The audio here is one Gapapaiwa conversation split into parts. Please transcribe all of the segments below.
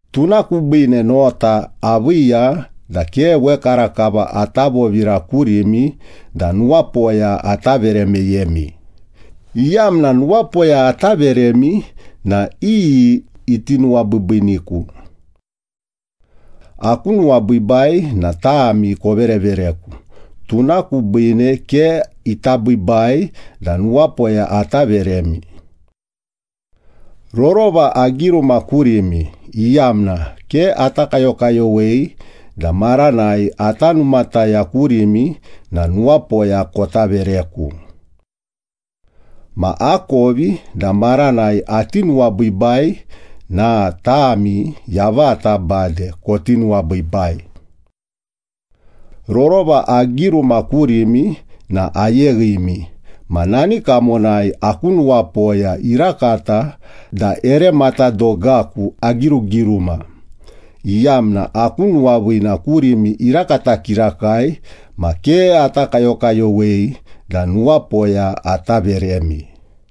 Tuna kubiine nota aviiya da ke wekarakava ata vovira kurimi da nuwapoya ata vere meyemi, iyamna nuwapoya ata veremi na iyi iti nuwabiibiiniku? Aku nuwabiibai na tami koverevereku, tuna kubiine ke ita biibai da nuwapoya ata veremi. Rorova agiruma kurimi, iyamna ke ata kayokayowei da maranai ata numataya kurimi na nuwapoya kota vereku. Ma akovi da maranai ati nuwabiibai na tami yavata bade koti nuwabiibai. Rorova agiruma kurimi na ayeghimi ma nani kamonai aku nuwapoya irakata da ere matadogaku agirugiruma, iyamna aku nuwaviina kurimi irakata kirakai ma ke ata kayokayowei da nuwapoya ata veremi.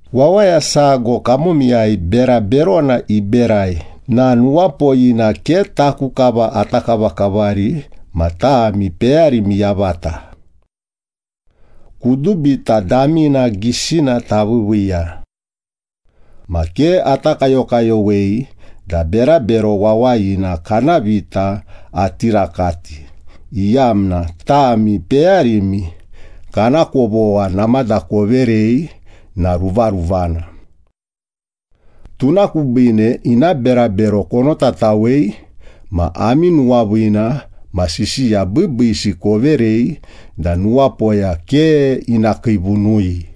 Wawaya sago kamomiyai bera berona iberai na nuwapoyina ke taku kava ata kavakavari ma tami peyarimi yavata. Kudubita damina gisina taviiviiya. Ma ke ata kayokayowei da berabero wawayina kana vita ati rakati, iyamna tami peyarimi kana kovogha namada koverei na ruvaruvana. Tuna kubiine ina berabero konotatawei, ma ami nuwaviina ma sisiya biibiisi koverei da nuwapoya ke ina kiivunui.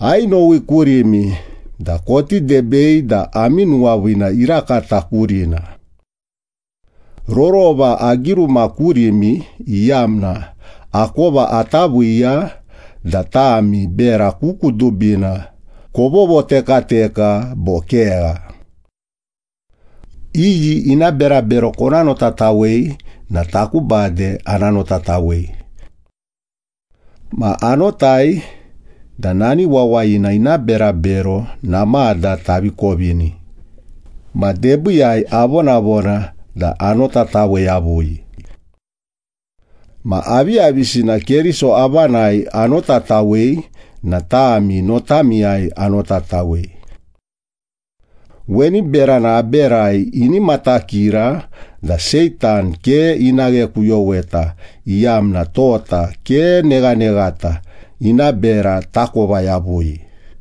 Ainowi kurimi da koti debei da ami nuwaviina irakata kurina. Rorova agiruma kurimi, iyamna akova ata viiya da tami bera ku kudubina kovovotekateka bo kegha. Iyi ina berabero kona notatawei na taku bade ana notatawei. Ma anotai da nani wawayina ina berabero namada tavi kovini, ma debiiyai avonavona da anotatawe yavui. Ma aviyavisina Keriso avanai anotatawei na tami notamiyai anotatawei. Weni berana aberai ini matakira da Seitan ke ina ghekuyoweta, iyamna tota ke neghaneghata, ina bera takova yavui.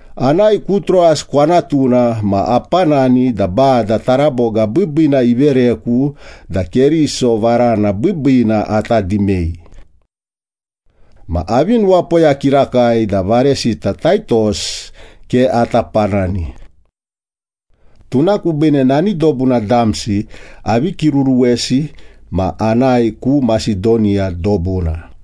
Anae ku Troas kwanatuna ma apanani da Bada taraboga biibiina ivereku da Keriso varana biibiina ata dimei. Ma avi nuwapoya kirakai da varesita Taitos ke ata panani. Tuna kubiine nani dobuna damsi avi kiruruwesi ma anae ku Masedoniya dobuna.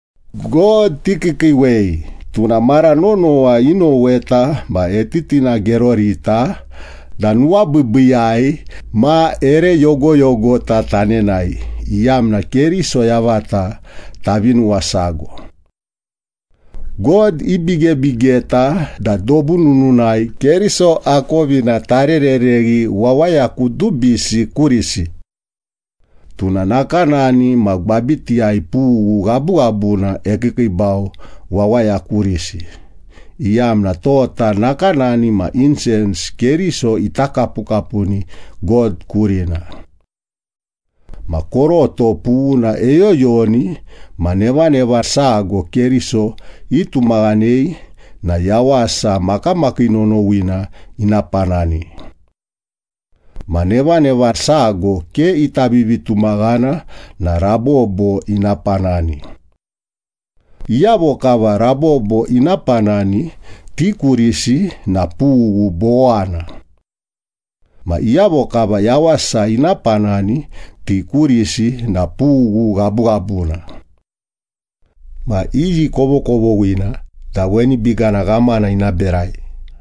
God tikiikiiwei, tuna mara nonowa inoweta ma etitinagerorita da nuwabiibiiyai ma ere yogoyogota tanenae, iyamna Keriso yavata tavi nuwasago. God ibigebigeta da dobu nununai Keriso akovina tarerereghi wawaya kudubisi kurisi. Tuna nakanani ma gwabitiyai pughu ghabughabuna ekiikiibau wawaya kurisi, iyamna tota nakanani ma insens Keriso ita kapukapuni God kurina. Ma koroto pughuna eyoyoni ma nevaneva sago Keriso itumaghanei na yawasa makamakii nonowina ina panani. Ma nevaneva sago ke ita vivitumaghana na rabobo ina panani. Iyavo kava rabobo ina panani, ti kurisi na pughu bowana. Ma iyavo kava yawasa ina panani, ti kurisi na pughu ghabughabuna. Ma iyi kovokovoghina da weni bigana ghamana ina berai?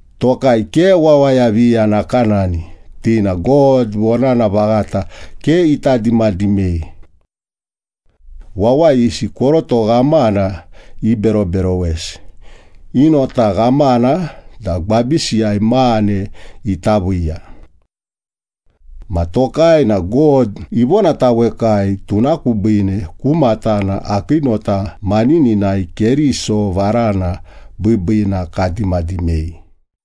Tokai ke wawaya viya nakanani, ti na God vonana vaghata ke ita dimadimei. Wawayisi koroto ghamana iberoberowesi, i nota ghamana da gwabisiyai mane ita viiya. Ma tokai na God ivonatawekai, tuna kubiine ku matana akii nota manininai Keriso varana biibiina kadimadimei.